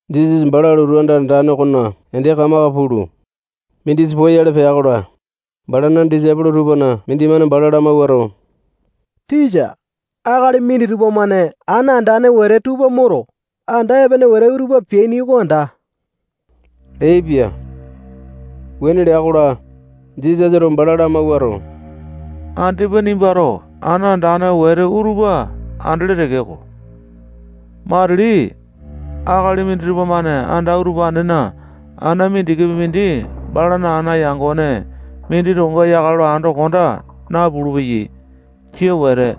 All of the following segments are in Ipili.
Jisasa bala lotu anda andane okona ende kamaka pulu, mindisa poyale pea-kola, balana disaipolo tupana mindimane bala lamawuato, tisa, akali minditupa-mane ana andane wete tupa moto, anda epene wete utupa peaini oko anda leaipia. Wuane lea-kola, Jisasato bala lamawuato, andipa nimbato anda andane wete utupa andele tekeko, matili akali minditupa-mane anda utupanena ana mindikipi mindi balana ana yangone mindi tokonga yakale lo ando konda napulu-peyai. Jia Wete.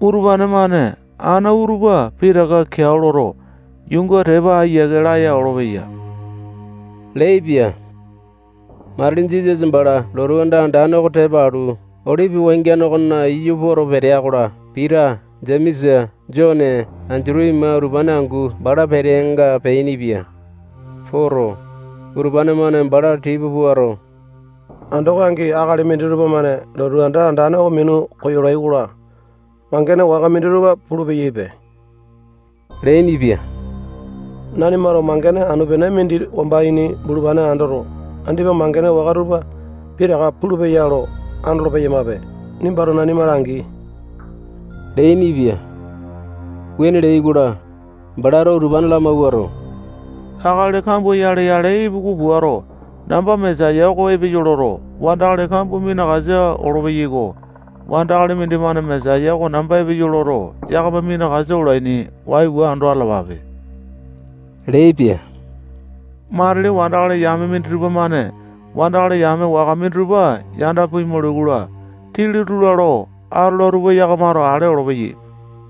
Utupane-mane ana utupa pitaka keao loto, yuunga tepa ayiake laya olopeya leaipia. Matili Jisasa bala lotu anda andane oko tepa alu, Olipi wangiane okona iyu poto petea-kola, Pita, Jemesa, Jone, Endutu ima utupane angu bala peteanga peainipia. Poto, utupane-mane bala tipa puato, andoko angi akali minditupa-mane lotu anda andane oko minu koyolai-kola, mangene waka minditupa pulu-peyaipe leainipia. Nanimato mangene anu-pene mindi wamba ini bulupane andoto, andipa mangene waka tupa pitaka puyale peya lo andolo-peyamape. Nimbato nanima langi leainipia. Wuane leai-kola, balato utupane lamawuato, akali kambua yale-yale ipuku puato, namba Mesaya oko epeyo loto, wandakali kambua minakasa olopeyai-ko. Wandakali mindimane Mesaya oko namba epeyo loto, yakama minakasa olaini. Waiwa ando atalapape leaipia. Matili wandakali yame minditupa-mane wandakali yame waka minditupa yanda pimaulai-kola, tili-tula lo atola tupa yakamato ale olopeyai.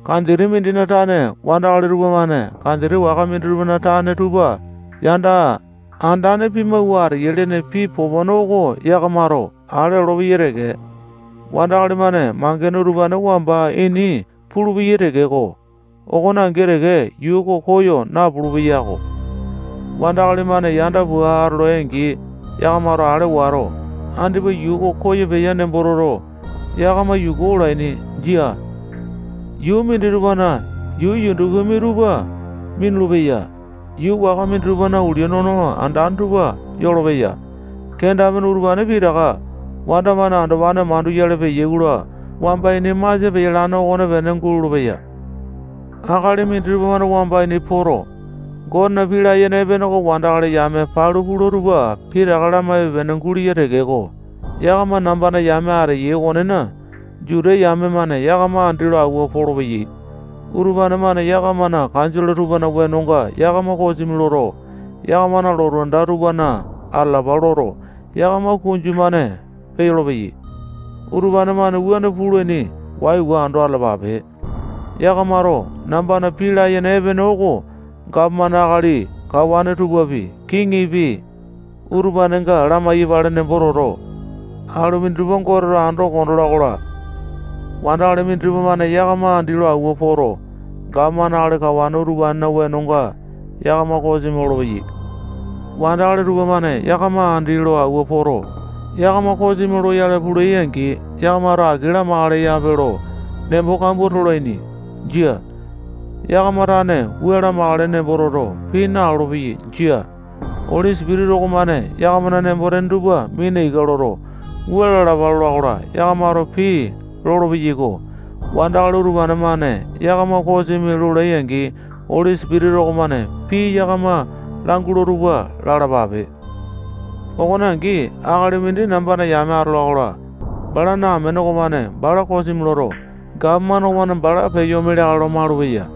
Kanjiti mindina tane wandakali tupamane kanjiti waka mindina tane tupa yanda andane pimawua ateyai lene pii popone oko yakamato ale olopeyai teke. Wandakali-mane mangene utupane wamba ini pulupeyai tekeko, okone angi teke yuu oko koyo napulu-peyako. Wandakali-mane yanda pua atolai-angi, yakamato ale wato, andipa yuu oko koyo peya nembo toto, yakama yuku olaini. Jia. Yuu minditupana yuu yundukumi tupa minulu-peya. Yuu waka minditupana ulia nono andane tupa yolopeya. Kenda-pene utupane pitaka wanda-mane andopane manduyale peya-kola, wamba ini masia peyalane okonepene gulolo-peya. Akali minditupa-mane wamba ini poto, Gotena pii layene epene oko wandakali yame palu peya tupa pitaka lamaipe-pene guleya tekeko, yakama nambana yame ateyai okonena, Juta yame-mane yakama andi lo awua polopeyai. Utupane-mane yakamana kanjole tupana wenonga yakama kosimi loto, yakamana lotu anda tupana atalapa loto, yakama kunju-mane peyolo-peyai. Utupane-mane wuane pulaini. Waiwa ando atalapape. Yakamato nambana pii layene epene oko gapomane akali kawane tupapi, kiŋipi, utupanenga lamai-yapale nembo toto, alu minditupa Goteto ando konda ola-kola, wandakali minditupa-mane yakama andi lo awua poto, gapomane akali kawane utupanena wenonga yakama kosimi lolopeyai. Wandakali tupamane yakama andi lo awua poto, yakama kosimi loyale pulai-angi, yakamato aki lamakalepe lo nembo kambua tolaini. Jia. Yakama tane wua lamakale nembo toto, pii nalolo-peyai. Jia. Oli Sipitisa okomane yakamana nembo-tene tupa mina ika loto, wua lalapa lola-kola, yakamato pii lolo-peyaiko. Wandakali utupane-mane yakama kosimi lolai-angi, Oli Sipitisa okomane pii yakama langula tupa lalapape. Okone angi, akali mindi nambana yame atola-kola, balana amene okomane bala kosimi loto, gapomane okomane bala peyo ome leakale lo malupeya.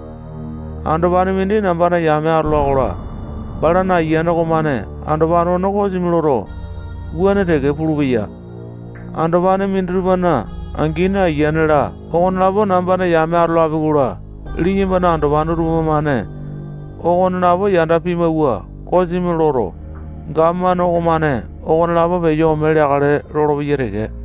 Andopane mindi nambana yame atola-kola, balana ayiane okomane andopane okone kosimi loto, wuane teke pulupeya. Andopane minditupana angini, ayiane-la, okonelapo nambana yame atolapi-kola, liyambana andopane utupane-mane okonelapo yanda pimawua, kosimi loto, gapomane okomane okonelapo peyo ome leakale lolopeyai teke.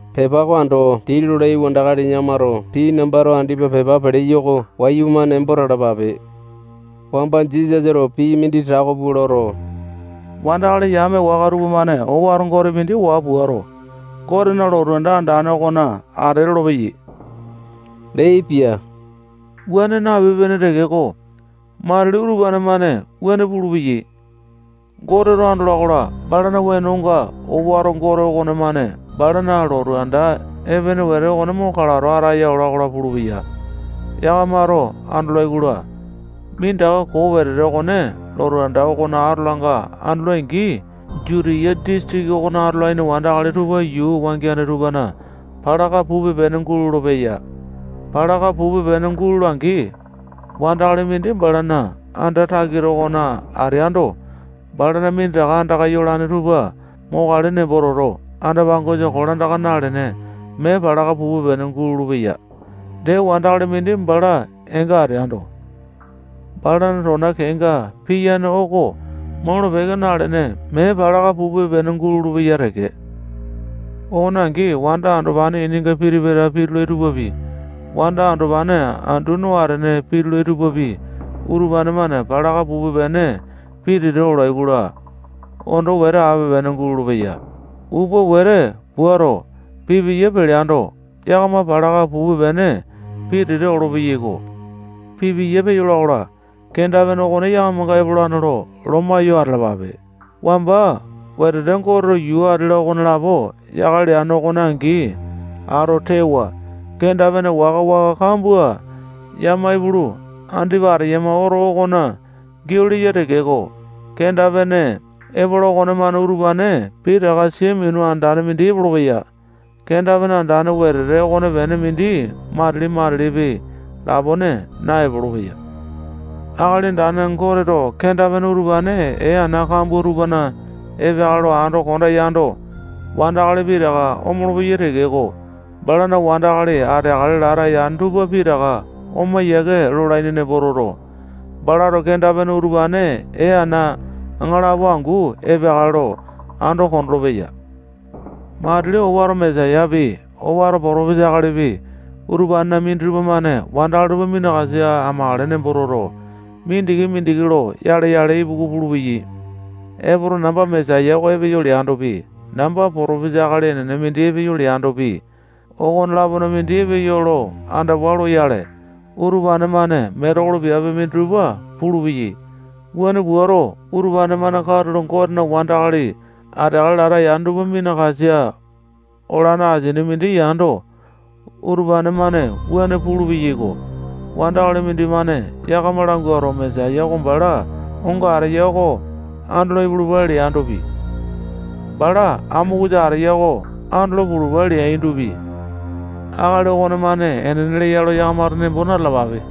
Pepa oko ando dii lolai wandakali yakamato pii nambato andipa pepa peleyo oko wayumane nembo talapape. Wamba Jisasato pii mindi tako pua loto, wandakali yame waka tupamane owato gote mindi waa puato, Gotena lotu anda andane okona ate lolopeyai leaipia. Wuane napipe-pene tekeko, matili utupane-mane wuane pulupeyai. Goteto andola-kola, balana wenonga owato gote okonemane balana lotu anda epene wete okone mo kalato ataya ola-kola pulupeya. Yakamato andolai-kola, minditaka koo wetete okone lotu anda okona atolanga andolai-angi, Jutiya disitiki okona atolaini wandakali tupa yuu wangiane tupana palaka pupe-pene gulolo-peya. Palaka pupe-pene gulola-angi, wandakali mindi balana anda takita okona ateando, balana minditaka andaka yolane tupa mokale nembo toto, anda-pangosa kolandaka nalene, mee palaka pupe-pene gulolo-peya. Dee, wandakali mindi bala eenga ateando, balana tona kenga piyane oko molo-peke nalene, mee palaka pupe-pene gulolo-peya teke. Okone angi, wanda andopane ininga piti-pata pitulai tupapi, wanda andopane andu no atene pitulai tupapi, utupane-mane palaka pupe-pene pitete olai-kola, ondo wete ape-pene gulolo-peya. Upa wete puato, pipiya peleando, yakama palaka pupe-pene pitete olopeyai-ko. Pipiya peyola-kola, kenda-pene okone yakamanga epolane lo loma yo atalapape. Wamba wetete Goteto yuu ati-la, okonelapo yakale leane okone angi ato tewa, kenda-pene waka-waka kambua yama ipulu, andipa ateyama oto okona giau leya tekeko, kenda-pene epola okonemane utupane pitaka sia minu andane mindi epolopeya. Kenda-pene andane wetete okonepene mindi matili-matilipi lapone naepolo-peya. Akali Andane Goteto kenda-pene utupane ee ana kambua tupana epeakale lo ando konda yando, wandakali pitaka omolo-peyai tekeko, balana wandakali ateakale lata yane tupa pitaka oma yiake lolaini nembo toto, balato kenda-pene utupane ee ana aŋalapo angu epeakale lo ando kondolo-peya. Matili owato Mesayapi, owato potopesa akalipi, utupanena minditupa-mane wandakali tupa minakasa amakale nembo toto, mindiki-mindiki lo yale-yale ipuku pulupeyai. Epoto, namba Mesaya oko epeyo leandopi, namba potopesa akali enene mindi epeyo leandopi, okone-lapona mindi epeyo lo andawa loyale, utupane-mane metekolo piape minditupa pulupeyai. Wuane puato, utupane-mane katulo Gotena wandakali ateakale lata yane tupa minakasa olane asini mindi yando, utupane-mane wuane pulu-peyaiko. Wandakali mindimane yakama languato, Mesaya oko bala onga ateya oko andolo ipulupa leandopi, bala amokusa ateya oko andolo pulupa leandopi, akali okonemane enene leya lo yakamato nembo na-talapape.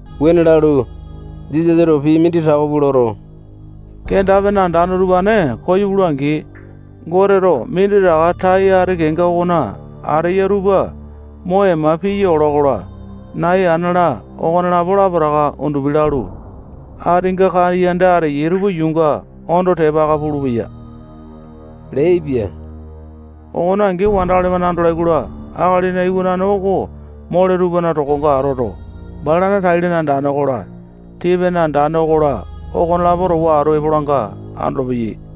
Wuane lalu, Jisasato pii mindi tako pua loto, kenda-pene andane utupane koyo pula-angi, Goteto minditaka tai ati kenga okona ateya tupa mo ema-ema piya ola-kola, nai, ana-la, okolapo lapotaka undupi lalu, atinga kaiyanda ateyai tupa yuunga ondo tepa aka pulupeya leaipia. Okone angi, wandakali-mane andolai-kola, Akalina Iwanane oko mole tupana tokonga atoto, balana tai-lene andane okola, tii-pene andane okola, okonelapo towa atu epolanga andolopeyai.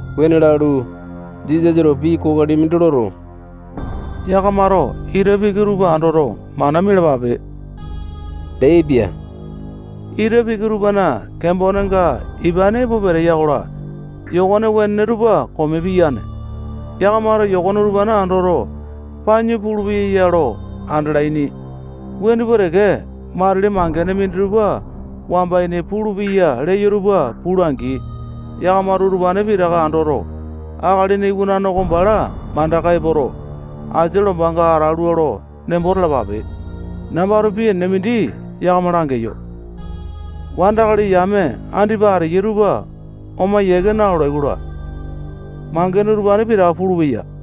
Wuane lalu, Jisasato pii kokoli mindi loto, yakamato ita piki tupa andoto, mana mialapape leaipia. Ita piki tupana kembonenga ipane epo peteya-kola, yokone wenene tupa kome piyane. Yakamato yokone utupane andoto, panyu puyale peya lo andalaini. Wuane pua teke, matili mangene minditupa wamba ini pulupeya leyo tupa pula-angi, yakamato utupane pitaka andoto, Akalina Iwanane oko bala mandaka epoto, asia lombanga atalua nembo talapape. Nambato pii enene mindi yakama langeyo. Wandakali yame andipa ateyai tupa oma yiake nalolai-kola, mangene utupane pitaka pulupeya.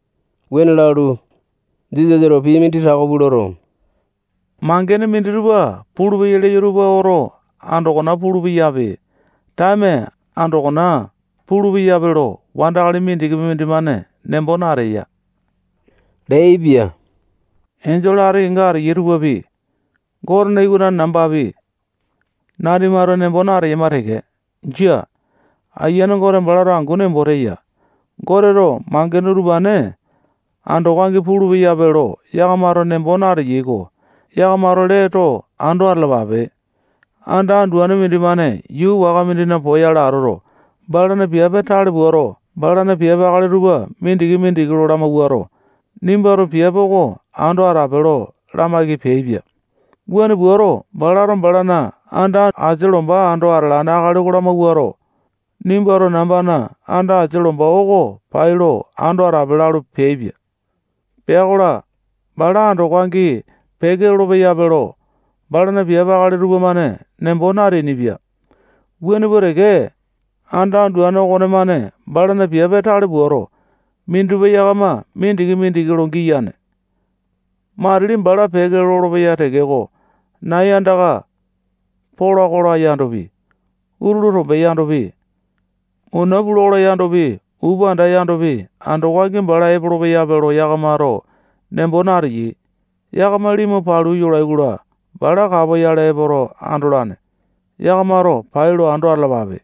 Wuane lalu, Jisasato pii mindi tako pua loto, mangene minditupa pulupeya leyo tupa oto andokona pulu-peyape, taeme andokona pulu-peyape lo, wandakali mindikipi mindimane nembo nateya leaipia. Enjole ati kenga ateyai tupapi, Gote iwanane nambapi, nanimato nembo nateyama teke. Jia. Ayiane Gote balato angu nembo teya. Goteto mangene utupane andoko angi pulu-peyape lo yakamato nembo nateyai-ko. Yakamato lee too ando atalapape. Anda anduane mindimane yuu waka mindina poyale atoto, balana piape tale puato, balana piape akali tupa mindiki-mindiki lo lamawuato, nimbato piape oko ando atape lo lamaiki peaipia. Wuane puato, balato balana anda asia lomba ando atalane akali oko lamawuato, nimbato nambana anda asia lomba oko pai lo ando atape lalu peaipia. Pea-kola, bala andoko angi peke lolo-peyape lo, balana piape akali tupamane nembo nateainipia. Wuane pua teke, anda anduane okonemane balana piape tale puato, minditupa yakama mindiki-mindiki lo giyane. Matili bala peke lolopeya tekeko, nai andaka pola-kola yandopi, utulu tombe yandopi, muna pula-kola yandopi, upanda yandopi, andoko angi bala epolo-peyape lo yakamato nembo nateyai. Yakama limu palu yolai-kola, bala kapoyale epoto andolane. Yakamato pai lo ando atalapape.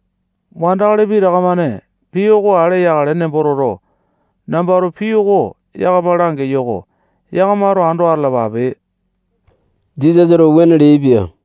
Wandakali pitaka-mane pii oko ale yakale nembo toto, nambato pii oko yakama langeyo-ko. Yakamato ando atalapape. Jisasato wuane leaipia.